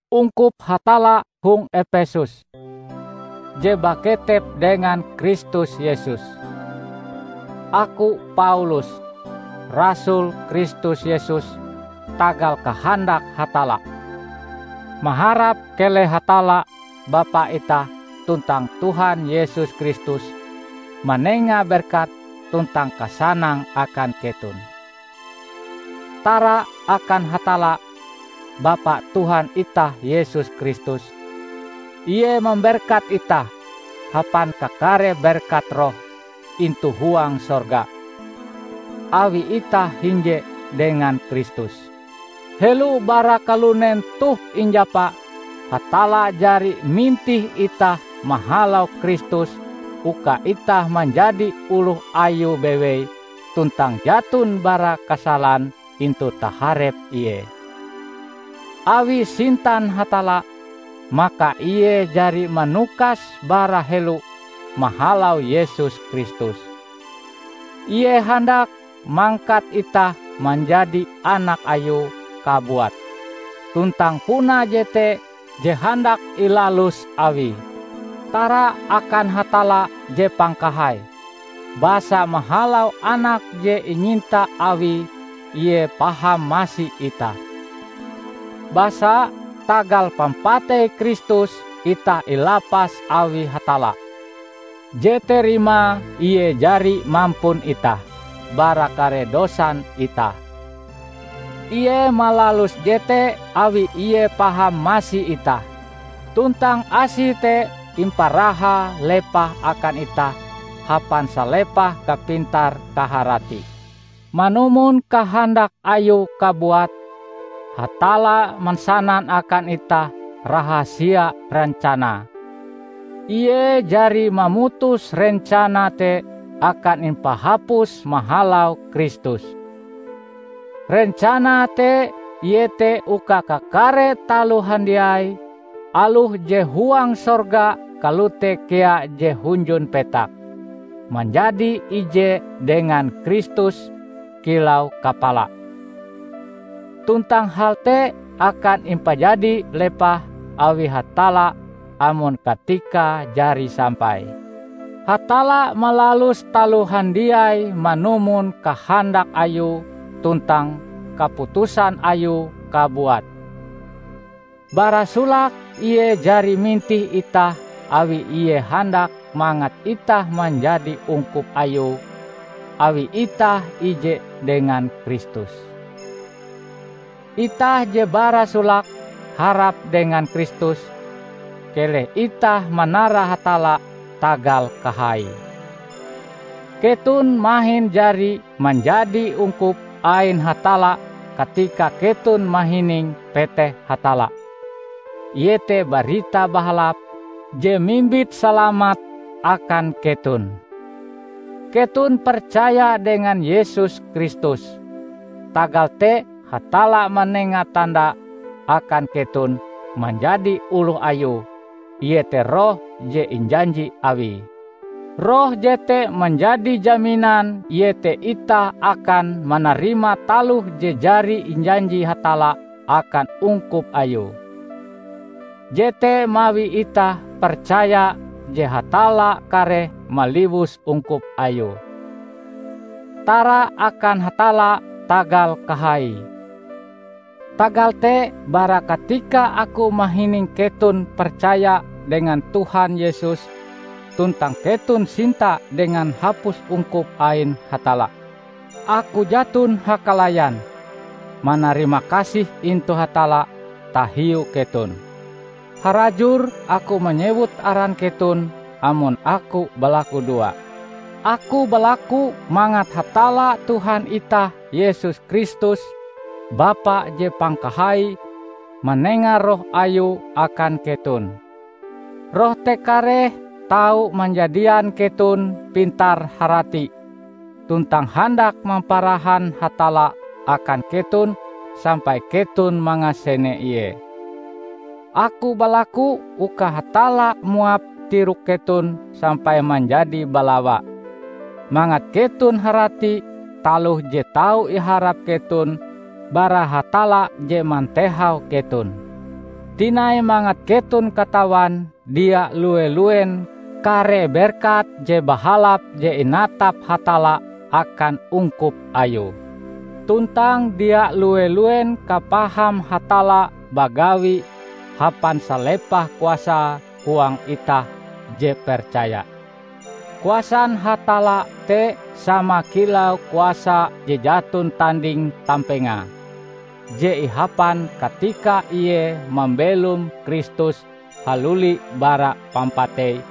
Ungkup Hatalla hong Epesus, je baketep dengan Kristus Yesus! Aku, Paulus, rasul Kristus Yesus tagal kahandak Hatalla, maharap keleh Hatalla Bapa itah tuntang Tuhan Yesus Kristus manenga berkat tuntang kasanang akan keton. Tara akan Hatalla, Bapa Tuhan itah Yesus Kristus! Ie mamberkat itah hapan kakare berkat roh intu huang sorga, awi itah hinje dengan Kristus. Helo bara kalunen toh injapa, Hatalla jari mintih itah mahalau Kristus uka itah manjadi oloh Ayue bewei tuntang jaton bara kasalan intu taharep Ie. Awi sintan Hatalla, maka Ie jari manukas bara helo mahalau Yesus Kristus, Ie handak mangkat itah manjadi anak Ayue kabuat. Tuntang puna jete je handak ilalus Awie. Tara akan Hatalla je pangkahai, basa mahalau Anake je inyinta Awie Ie paham masi itah. Basa, tagal pampatei Kristus itah ilapas awi Hatalla, jete rimae Ie jari mampun itah bara kare dosan itah. Ie malalus jete awi Ie paham masi itah, tuntang Asie te imparahae lepah akan itah hapan salepah kapintar-kaharati. Manumon kahandak Ayue kabuat, Hatalla mansanan akan itah rahasia rencanae; Ie jari mamutus rencanae te akan impahapus mahalau Kristus. Rencanae te iete uka kakare taloh handiai, aloh je huang sorga kalote kea je hunjun petak, manjadi ije dengan Kristus kilau kapala. Tuntang hal te akan impajadi lepah awi Hatalla amon katikae jari sampai. Hatalla malalus taloh handiai manumon kahandak Ayue tuntang kaputusan Ayue kabuat. Bara solake Ie jari mintih itah awi Ie handak mangat itah manjadi ungkup Ayue awi itah ije dengan Kristus. Itah je bara solake harap dengan Kristus, keleh itah manara Hatalla tagal kahaie! Keton mahin jari manjadi ungkup ain Hatalla katika keton mahining peteh Hatalla, iete Barita Bahalap je mimbit salamat akan keton. Keton percaya dengan Yesus Kristus, tagal te Hatalla manenga tanda akan keton manjadi oloh Ayue, iete Roh je injanji Awie. Roh jete manjadi jaminan iete itah akan manarima taloh je jari injanji Hatalla akan ungkup Ayue. Jete mawi itah percaya je Hatalla kareh maliwus ungkup Ayue. Tara akan Hatalla tagal kahaie! Tagal te, bara katika aku mahining keton percaya dengan Tuhan Yesus, tuntang keton sinta dengan hapus ungkup ain Hatalla, aku jaton hakalayan manarimakasih intu Hatalla tahiu keton. Harajur aku manyewut aran keton amon aku balakudoa. Aku balaku mangat Hatalla Tuhan itah Yesus Kristus, Bapa je pangkahai, manenga Roh Ayue akan keton. Roh te kareh tau manjadian keton pintar-harati, tuntang handak mamparahan Hatalla akan keton sampai keton mangasene Ie. Aku balaku uka Hatalla muap tirok keton sampai manjadi balawa; mangat keton harati taloh je tau iharap keton bara Hatalla je mantehau keton. Tinai mangat keton katawan dia lue-luen kare berkat je bahalap je inatap Hatalla akan ungkup Ayue; tuntang dia lue-luen kapaham Hatalla bagawi hapan salepah kuasae huang itah je percaya. Kuasan Hatalla te sama kilau kuasa je jaton tanding-tampengae je ihapan katika Ie mambelom Kristus haluli bara pampatei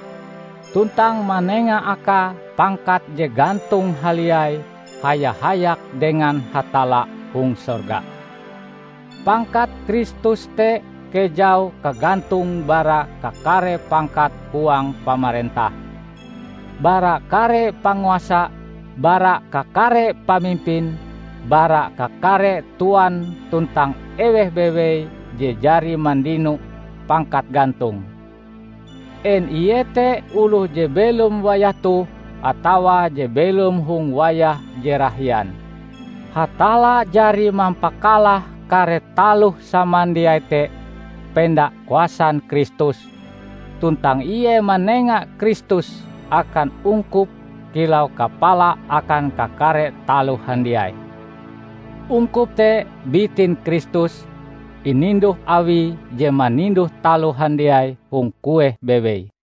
tuntang manenga Akae pangkat je gantong haliai haya-hayak dengan Hatalla hong sorga. Pangkat Kristus te kejau kagantonge bara kakare pangkat huang pamarentah, bara kare panguasa, bara kakare pamimpin, bara kakare tuan tuntang eweh bewei je jari mandino pangkat gantong; en ie te oloh je belom wayah toh atawa je belom hong wayah je rahian. Hatalla jari mampakalah kare taloh samandiai te penda kuasan Kristus, tuntang Ie manenga Kristus akan ungkup kilau kapala akan kakare taloh handiai. Ungkup te bitin Kristus, ininduh Awie je maninduh taloh handiai hong kueh bewei.